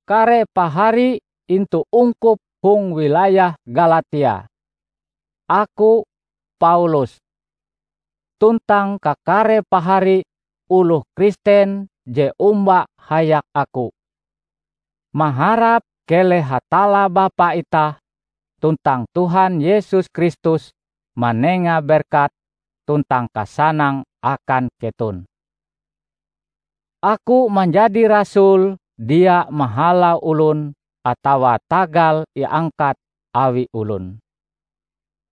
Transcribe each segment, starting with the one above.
Kare pahari intu ungkup hong wilayah Galatia, aku, Paulus, tuntang kakare pahari oloh Kristen je omba hayak aku, maharap keleh Hatalla Bapa itah tuntang Tuhan Yesus Kristus manenga berkat tuntang kasanang akan keton. Aku manjadi rasul dia mahalau olon atawa tagal iangkat awi olon,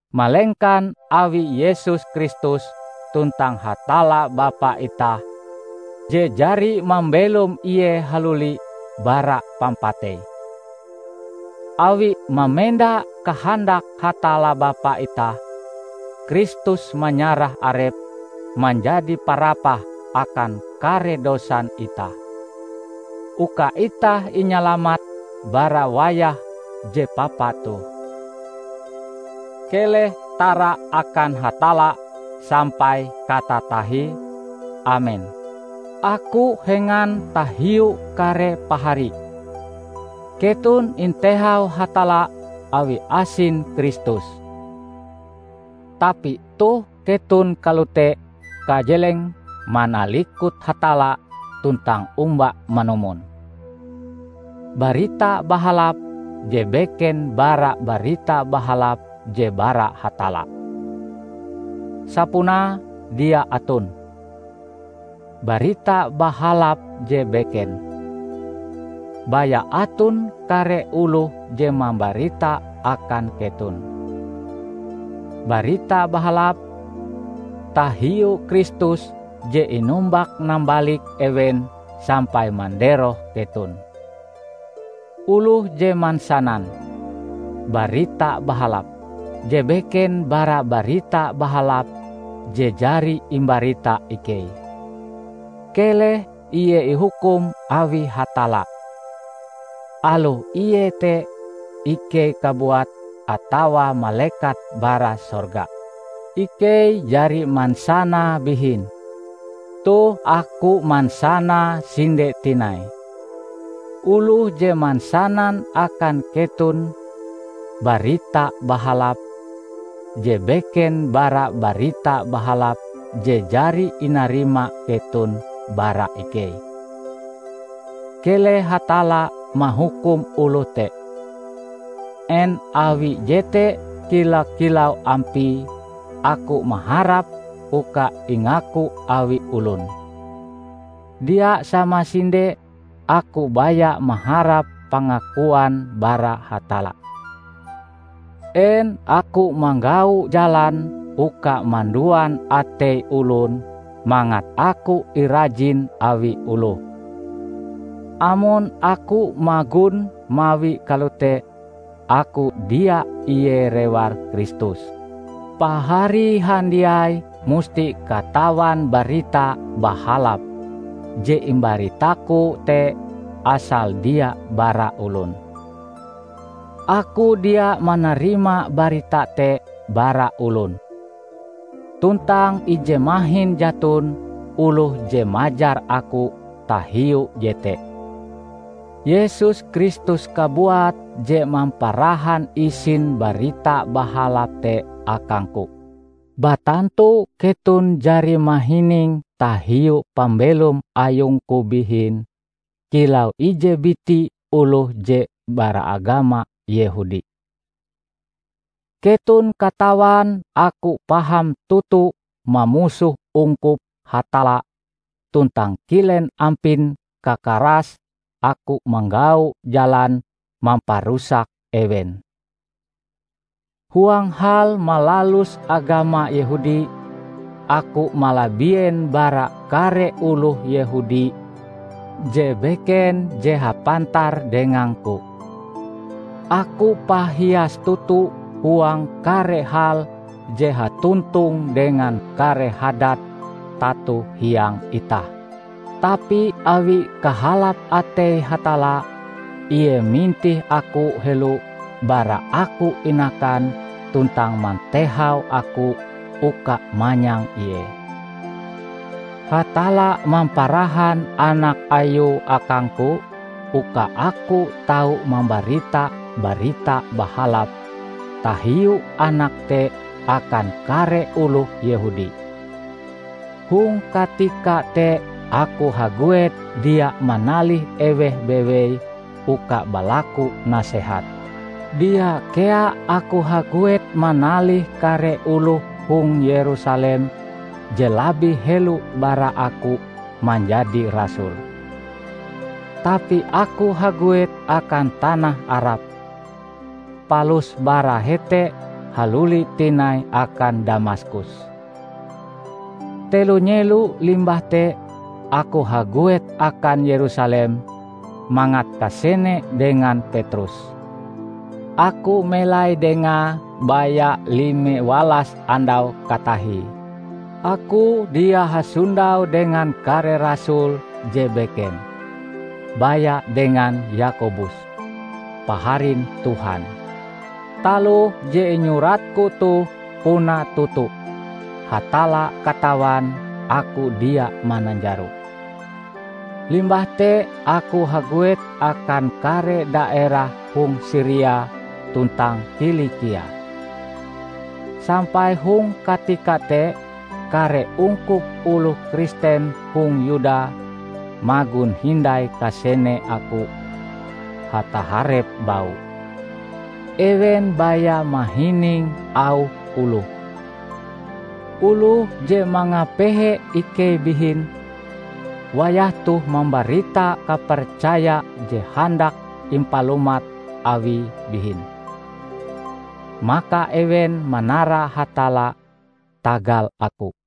malengkan awi Yesus Kristus tuntang Hatalla Bapa itah je jari mambelom Ie haluli bara pampatei. Awi mamenda kahandak Hatalla Bapa itah, Kristus manyarah Arepe manjadi parapah akan kare dosan itah, uka itah inyalamat bara wayah je papa toh. Keleh tara akan Hatalla sampai katatahie! Amen. Aku hengan tahiu kare pahari! Keton intehau Hatalla awi asin Kristus, tapi toh keton kalote kajelenge manalikut Hatalla tuntang omba manumon "barita bahalap" je beken bara Barita Bahalap je bara Hatalla. Sapunae dia aton "barita bahalap je beken". Baya aton kare oloh je mambarita akan keton "barita bahalap" tahiu Kristus je inumbak-nambalik ewen sampai manderoh keton. Oloh je mansanan "barita bahalap" je beken bara Barita Bahalap je jari imbarita ikei, keleh ie ihukum awi Hatalla -- aloh ie te ikei kabuat atawa malekat bara sorga! Ikei jari mansanae bihin, toh aku mansanae sinde tinai: Oloh je mansanan akan keton "barita bahalap" je beken bara Barita Bahalap je jari inarima keton bara ikei, keleh Hatalla mahukum oloh te. En awi jete kila-kilau ampie aku maharap uka ingaku awi olon? Dia samasinde! Aku baya maharap pangakuan bara Hatalla. En aku manggau jalan uka manduan atei olon mangat aku irajin awi oloh? Amon aku magon mawie kalote, aku dia ie rewar Kristus. Pahari handiai musti katawan Barita Bahalap je imbaritaku te asale dia bara olon. Aku dia manarima barita te bara olon, tuntang ije mahin jaton oloh je majar aku tahiu jete. Yesus Kristus kabuat je mamparahan isin Barita Bahalap te akangku. Batantu keton jari mahining tahiu pambelom ayungku bihin kilau ije biti oloh je bara agama Yehudi. Keton katawan aku paham toto mamusoh ungkup Hatalla tuntang kilen ampin kakarase aku manggau jalan mamparusak ewen. Huang hal malalus agama Yehudi, aku malabien bara kare oloh Yehudi je beken je hapantar dengangku. Aku pahias toto huang kare hal je hatontong dengan kare hadat tato hiang itah. Tapi awi kahalap atei Hatalla, Ie mintih aku helo bara aku inakan tuntang mantehau aku uka manyang Ie. Hatalla mamparahan Anak Ayue akangku uka aku tau mambarita Barita Bahalap tahiu Anak te akan kare oloh Yehudi. Hong katika te aku haguet dia manalih eweh bewei uka balaku nasehat. Dia kea aku haguet manalih kare oloh hong Yerusalem je labih helo bara aku manjadi rasul. Tapi aku haguet akan tanah Arab, palus bara hete haluli tinai akan Damaskus. Telo nyelo limbah te, aku haguet akan Yerusalem mangat kasene dengan Petrus. Aku melai dengae baya lime walas andau katahie. Aku dia hasondau dengan kare rasul je beken, baya dengan Yakobus, paharin Tuhan. Taloh je inyuratku toh, puna toto. Hatalla katawan aku dia mananjaro! Limbah te aku haguet akan kare daerah hong Siria tuntang Kilikia. Sampai hong katika te kare ungkup oloh Kristen hong Yuda magon hindai kasene aku hataharep bau. Ewen baya mahining auh oloh, "Oloh je mangapehe ikei bihin, wayah toh mambarita kapercaya je handak impalumat awie bihin." Maka ewen manara Hatalla tagal aku.